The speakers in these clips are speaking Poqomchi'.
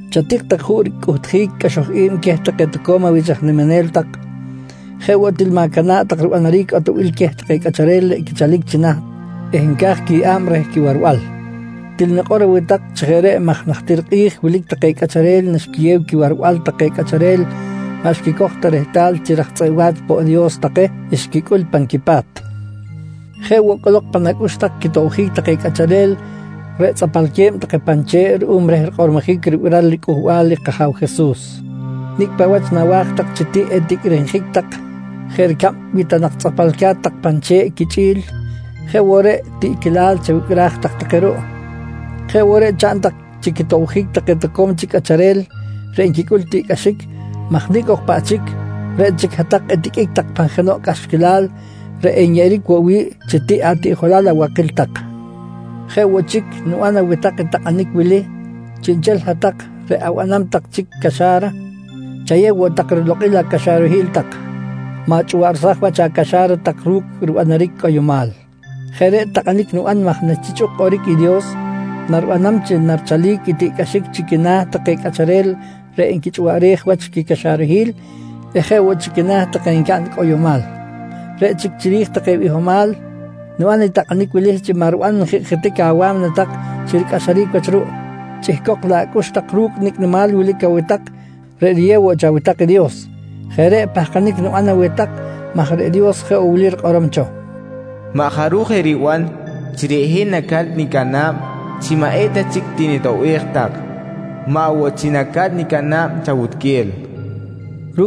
Chatik tak juꞌ ricꞌuhtjic i cꞌaxoj i̱b queh take toco̱m awich aj niminel tak. Jeꞌ woꞌ til ma̱cana̱ꞌ tak ribanaric atoꞌbil queh take cꞌacharel reꞌ quichalic chi naht eh nca̱j quiyeꞌa̱b reh quiwarbal. Til nikꞌor aweh tak chi jeꞌ reꞌ maj najtir kꞌi̱j wilic take cꞌacharel naxquiyew quiwarbal take cꞌacharel maꞌ xquicoj ta rehtal chi raj tzꞌeꞌ wa̱ch poꞌ i Dios take xquicꞌul pan quipa̱t. Jeꞌ woꞌ cꞌolok pan acꞌux tak quitobjic take cꞌacharel reꞌ tzꞌapalque̱b take pan che̱ꞌ ruꞌum reh rikꞌormojic ribiral riCꞌuhbal i kAja̱w Jesus. Nicꞌ paꞌ wach nawa̱j tak chi tiꞌ eticꞌrinjic tak jeꞌ ricab wi ta nak tzꞌapalca̱t tak pan che̱ꞌ quichꞌi̱l, jeꞌ woꞌ reꞌ tiꞌquilal chawicꞌraj tak take ruꞌ. Jeꞌ woꞌ reꞌ chaꞌn tak chi quitobjic take toco̱m chic cꞌacharel reꞌ nquicꞌul tiꞌcꞌaxic maj nicꞌ ok paꞌ chic, reꞌ chic hat-tak etiqꞌuic tak pan jenoꞌ cꞌaxquilal reꞌ enyeꞌeric woꞌ wi̱ꞌ chi tiꞌ atiꞌjolal abakil tak. Jeꞌ woꞌ chic niban aweh tak i takꞌanic wili: Chiꞌnchel hat-tak reꞌ abanam tak chic caxa̱ra, chayew woꞌ tak rilokꞌil acaxarahil tak. Ma̱chꞌuwaꞌrsaj wach acaxa̱ra tak ru̱cꞌ ribanaric cꞌoyomal. Jeꞌ reꞌ takꞌanic niban maj nachichꞌuk kꞌoric i Dios, naribanam chi narichalic i tiꞌcꞌaxic chi quina̱ take cꞌacharel reꞌ nquichꞌuwaꞌrej wach i quicaxarahil eh jeꞌ woꞌ chi quina̱ take ncaꞌn i cꞌoyomal. Reꞌ chic chiri̱j take bihomal, niban i takꞌanic wili chi maꞌ riban njikꞌjitic awa̱mna tak chi ricꞌaxaric wach ruꞌ, chꞌihcok laꞌ acꞌux tak ru̱cꞌ nicꞌ nimal wilic aweh tak reꞌ riyeb woꞌ cho aweh tak i Dios. Jeꞌ reꞌ pahkanic niban aweh tak maj reꞌ Dios jeꞌ woꞌ wili rikꞌorom cho: “Maꞌ jaruj eriban chi reꞌ hin naca̱t nicana̱b chi maꞌ eta chic tinitoꞌbej tak, maꞌ woꞌ chi naca̱t nicana̱b chawutquel, nqui rikꞌorom cho.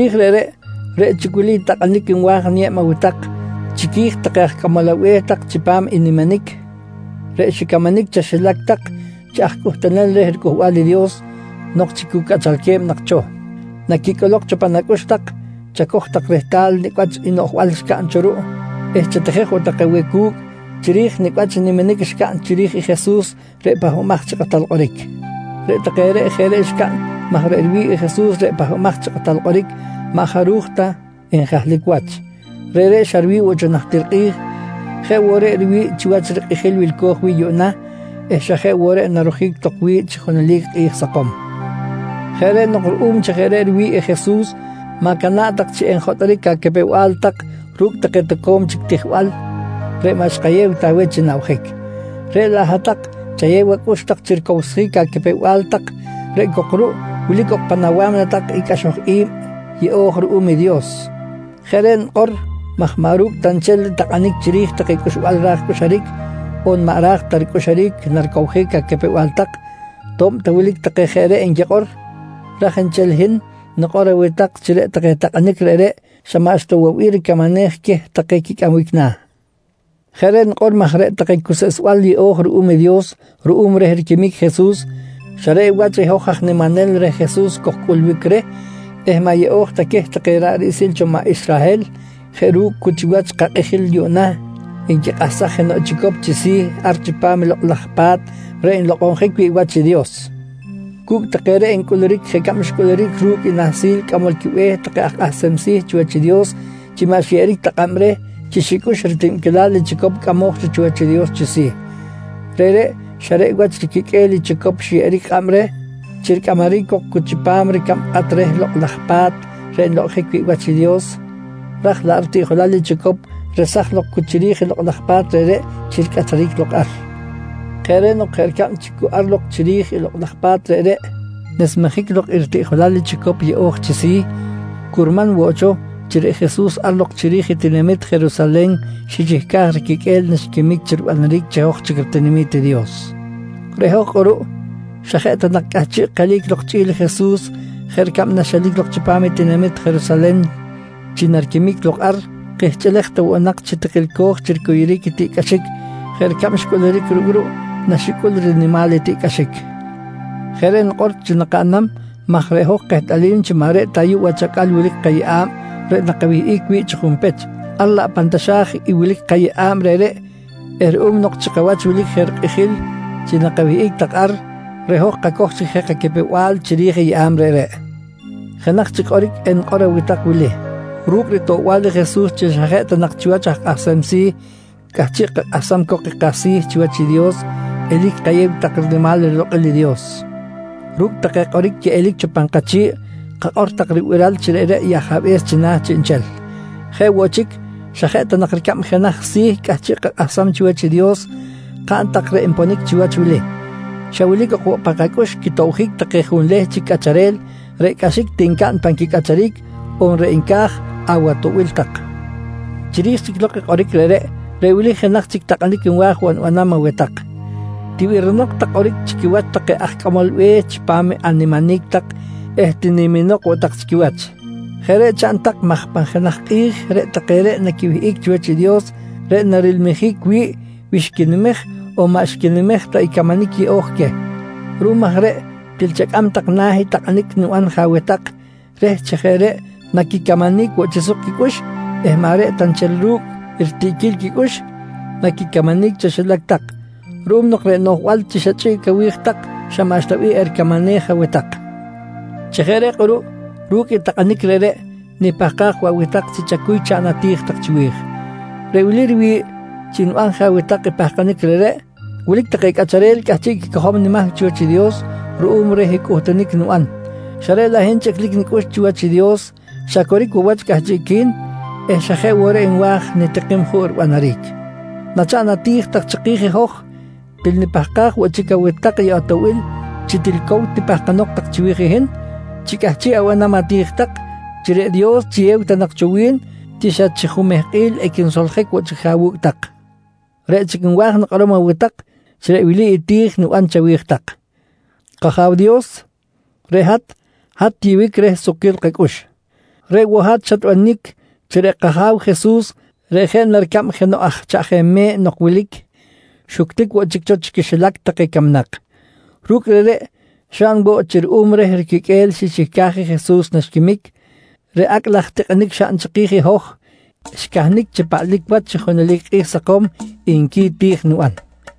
Chiri̱j reꞌreꞌ, reꞌ chic i wili i takꞌanic nwa̱j niyeb aweh tak chiqui̱j take aj cꞌamol abe̱h tak chipam i niminic, reꞌ xicamanic chaxilac tak chi aj cꞌuhtunel reh riCꞌuhbal i Dios nok chi cu cꞌachalque̱b nak cho: Naquicꞌolok cho pan acꞌux tak, chacoj tak rehtal nicꞌ wach i noꞌjbal xcaꞌn cho ruꞌ eh chatijej woꞌ tak aweh cu̱cꞌ chiri̱j nicꞌ wach i niminic xcaꞌn chiri̱j i Jesus reꞌ Pahbamaj chi Kꞌatal Kꞌoric. Reꞌ take reꞌ jeꞌ reꞌ xcaꞌn maj reꞌ riwi̱ꞌ i Jesus reꞌ Pahbamaj chi Kꞌatal Kꞌoric maꞌ jaruj ta njahlic wach. Reꞌreꞌ xa riwi̱ꞌ woꞌ cho najtir kꞌi̱j, jeꞌ woꞌ reꞌ riwi̱ꞌ chiwach i rikꞌijil wilco̱j wi̱ꞌ yuꞌna eh xa jeꞌ woꞌ reꞌ narojic tok wi̱ꞌ chi junelic kꞌi̱j sakom. Jeꞌ reꞌ nok ruꞌum chi jeꞌ reꞌ riwi̱ꞌ i Jesus, ma̱cana̱ꞌ tak chi enjotꞌoric acapew-bal tak ru̱cꞌ take toco̱m chic tijbal reꞌ maꞌ xkayew ta aweh chi nabjic. Reꞌ laꞌ hat-tak chayew acꞌux tak chi ricowsjic acapew-bal tak reꞌ cok ruꞌ wilic ok pan awa̱mna tak i cꞌaxoj i̱b yeꞌo̱j ruꞌum i Dios. Jeꞌ reꞌ nikꞌor maj maꞌ ru̱cꞌ ta nchel i takꞌanic chiri̱j take cꞌuxbal ra̱j cꞌuxuric, on maꞌ ra̱j ta ricꞌuxuric naricowjic acapew-bal tak, to̱b ta wilic take jeꞌ reꞌ nquikꞌor. Raj nchel i hin nikꞌor aweh tak chi reꞌ take takꞌanic reꞌreꞌ xa maꞌxta woꞌ bih ricamanej queh take quicꞌambic na̱. Jeꞌ reꞌ nikꞌor maj reꞌ take cuseꞌsbal yeꞌo̱j ruꞌum i Dios ruꞌum reh riquimic i Jesus, xa reꞌ wach i hoj aj niminel reh Jesus kojcꞌulbic reh eh maꞌ yeꞌo̱j ta queh take maꞌ ra̱ꞌ riꞌsil cho maꞌ Israhel jeꞌ ru̱cꞌ cu chiwach kakꞌijil yuꞌna nquikꞌahsaj jenoꞌ chicop chi si̱ ar chipam i Lokꞌ laj Pa̱t reꞌ nlokꞌonjic wi̱ꞌ wach i Dios. Cu̱cꞌ take reꞌ ncꞌuluric jeꞌ ricab xcꞌuluric ru̱cꞌ i Nahsil Cꞌamol quiBe̱h take aj kꞌahsem si̱ chiwach i Dios chi maꞌ xyeꞌeric ta kꞌab reh chi xicꞌux i ritibquilal i chicop cꞌamoj cho chiwach i Dios chi si̱. Reꞌreꞌ xa reꞌ wach riquiqꞌue̱l i chicop xyeꞌeric kꞌab reh chi ricꞌamaric cok cu chipam ricab kꞌat reh Lokꞌ laj Pa̱t reꞌ nlokꞌonjic wi̱ꞌ wach i Dios ra̱j laꞌ ritiꞌjolal i chicop resaj lok cu chiri̱j i lokꞌ laj pa̱t reꞌreꞌ chi ricꞌataric lok ar. Jeꞌ reꞌ nok jeꞌ ricab chi cu ar lok chiri̱j i lokꞌ laj pa̱t reꞌreꞌ nesmejic lok i ritiꞌjolal i chicop yeꞌo̱j chi si̱, curman woꞌ cho chi reꞌ Jesus ar lok chiri̱j i tinamit Jerusalen xichihcaj i riquiqꞌue̱l naxquimic chi ribanaric chi hoj chic ritinami̱t i Dios. Reꞌ hoj kꞌuruꞌ, xa jeꞌ ta nak cꞌahchiꞌ kelic lok chꞌi̱l i Jesus jeꞌ ricab naxelic lok chipam i tinamit Jerusalen chi nariquimic lok ar, kihchꞌilej ta woꞌ nak chi tikilco̱j chi ricuyuric i tiꞌcꞌaxic jeꞌ ricab xcꞌuluric ru̱cꞌ ruꞌ naxicꞌul rinimal i tiꞌcꞌaxic. Jeꞌ reꞌ nikꞌor chi nakaꞌnam maj reꞌ hoj kehtꞌalim chi maꞌ reꞌ ta ayuꞌ wach acꞌal wilic i kayeꞌa̱b reꞌ nakawihꞌic wi̱ꞌ chi junpech, ar laꞌ pan taxa̱j i wilic kayeꞌa̱b reꞌreꞌ eh ruꞌum nok chi kawach wilic je rikꞌijil chi nakawihꞌic tak ar, reꞌ hoj kacoj chic je kacapew-bal chiri̱j i yeꞌa̱b reꞌreꞌ. Jenaj chic kꞌoric enikꞌor aweh tak wili: Ru̱cꞌ ritoꞌbal i Jesus chi xa jeꞌ ta nak chiwach aj kꞌahsem si̱ cꞌahchiꞌ kakꞌahsam cok i kasi̱ chiwach i Dios, eli̱c kayew tak rinimal rilokꞌil i Dios. Ru̱cꞌ take kꞌoric quiꞌelic cho pan kachi̱ꞌ, kakꞌor tak ribiral chi reꞌreꞌ i Ajabe̱s china̱ chiꞌnchel. Jeꞌ woꞌ chic, xa jeꞌ ta nak ricab jenaj si̱ cꞌahchiꞌ kakꞌahsam chiwach i Dios, kaꞌn tak reꞌ nponic chiwach wili: Xa wilic ok woꞌ pan kacꞌux quitobjic take junleh chic cꞌacharel reꞌ cꞌaxic ti ncaꞌn pan quicꞌacharic, on reꞌ nca̱j awatoꞌbil tak. Chiri̱j chic lok i kꞌoric reꞌreꞌ, reꞌ wili jenaj chic takꞌanic nwa̱j woꞌ nibanam aweh tak: Tibirinok tak kꞌoric chi quiwach take aj cꞌamol be̱h chipam animinic tak eh tiniminok woꞌ tak chi quiwach. Jeꞌ reꞌ chaꞌn tak maj pan jenaj kꞌi̱j reꞌ take reꞌ naquiwihꞌic chiwach i Dios reꞌ narilmijic wi̱ꞌ wi xquinimej on maꞌ xquinimej ta i camanic yeꞌo̱j queh. Ruꞌum aj reꞌ til chacꞌam tak na̱ i takꞌanic niban je aweh tak reh chi jeꞌ reꞌ naquicamanic woꞌ chi suk quicꞌux eh maꞌ reꞌ ta nchel ru̱cꞌ i ritiꞌquil quicꞌux naquicamanic chaxilac tak ruꞌum nok reꞌ noꞌjbal chi xa chꞌiꞌc awi̱j tak xa maꞌxta bih ericamanej aweh tak. Chi jeꞌ reꞌ kꞌuruꞌ ru̱cꞌ i takꞌanic reꞌreꞌ, nipahkaj woꞌ aweh tak chi chacuy chaꞌn ati̱j tak chiwi̱j. Reꞌ wili riwi̱ꞌ chi niban je aweh tak i pahkanic reꞌreꞌ: Wilic take cꞌacharel cꞌahchiꞌ quicojom nimahc chiwach i Dios ruꞌum reh cꞌuhtunic niban, xa reꞌ laꞌ hin chꞌiclic nicꞌux chi chiwach i Dios xa coric woꞌ wach cꞌahchiꞌqui̱n eh xa jeꞌ woꞌ reꞌ nwa̱j nitikim juꞌ ribanaric. Nachaꞌn ati̱j tak chiki̱j i hoj, til nipahkaj woꞌ chic aweh tak i atoꞌbil chi til cow tipahkanok tak chiwi̱j i hin chi cꞌahchiꞌ abanam ati̱j tak chi reꞌ Dios chiyew ta nak cho wi̱n chi xa chi jumehkꞌil equinsoljic woꞌ chic jeꞌ awu̱cꞌ tak. Reꞌ chic nwa̱j nikꞌorom aweh tak chi reꞌ wili i ti̱j niban chawi̱j tak: «K-Aja̱w Dios, reꞌ hat, hat tiyeꞌbic reh sukquil kacꞌux. Reꞌ woꞌ hat xatbanic chi reꞌ kAja̱w Jesus reꞌ jeꞌ na ricab jenoꞌ aj chaꞌjem me̱ꞌ nok wilic, xuctic woꞌ chic cho chi quixilac take camnak. Ru̱cꞌ reꞌreꞌ xaꞌn woꞌ chi ruꞌum reh riquiqꞌue̱l xichihcaj i Jesus naxquimic, reꞌ acꞌ laj tikꞌinic xaꞌn chiki̱j i hoj xcahnic chi paꞌlic wach chi junelic kꞌi̱j sakom, nqui i ti̱j niban.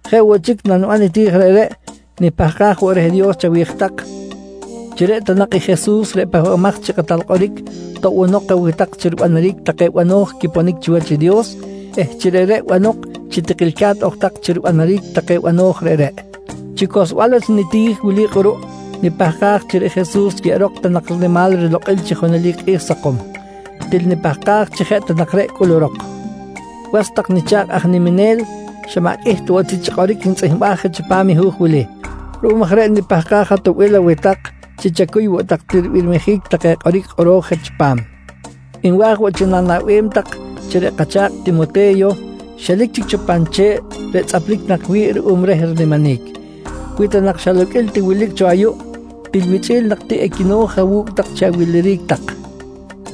Jeꞌ woꞌ chic naniban i ti̱j reꞌreꞌ, nipahkaj woꞌ reh Dios chawi̱j tak chi reꞌ ta nak i Jesus reꞌ Pahbamaj chi Kꞌatal Kꞌoric toꞌbonok aweh tak chi ribanaric take bano̱j quiponic chiwach i Dios eh chi reꞌreꞌ banok chi tikilca̱t ok tak chi ribanaric take bano̱j reꞌreꞌ. Chi cohlsbal wach i niti̱j wili kꞌuruꞌ, nipahkaj chi reꞌ Jesus yeꞌerok ta nak rinimal rilokꞌil chi junelic kꞌi̱j sakom. Til nipahkaj chi jeꞌ ta nak reꞌ cꞌulurok. Was tak nicha̱kꞌ aj nimimel, xa maꞌ qꞌuih ta woꞌ ti chi kꞌoric xnitzꞌihmbaj je chipam i hu̱j wili. Ruꞌum aj reꞌ nipahkaj atoꞌbil aweh tak chi chacuy woꞌ tak ti ribirmijic take kꞌoric kꞌoro̱j je chipam. Nwa̱j woꞌ chi na̱naꞌbem tak chi reꞌ kacha̱kꞌ Timote̱yo xelic chic cho pan che̱ꞌ reꞌ tzꞌaplic nak wi̱ꞌ ruꞌum reh riniminic. Wi ta nak xa loqꞌuil ti wilic cho ayuꞌ, til wichꞌi̱l nak ti equino̱j awu̱cꞌ tak chi awiliric tak.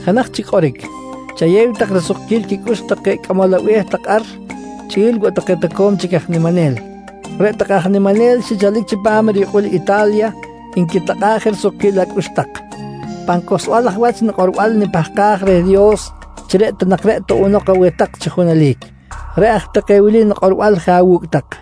Jenaj chic kꞌoric. Chayew tak risukquil quicꞌux take cꞌamol abe̱h tak ar chꞌi̱l woꞌ take toco̱m chic aj niminel. Reꞌ take aj niminel xichalic chipam i riyukꞌul Ita̱lya nquitakꞌa̱ꞌ je risukquil acꞌux tak. Pan cohlsbal aj wach nikꞌorbal nipahkaj reh Dios chi reꞌ ta nak reꞌ toꞌbonok aweh tak chi junelic. Reꞌ aj take wili nikꞌorbal je awu̱cꞌ tak.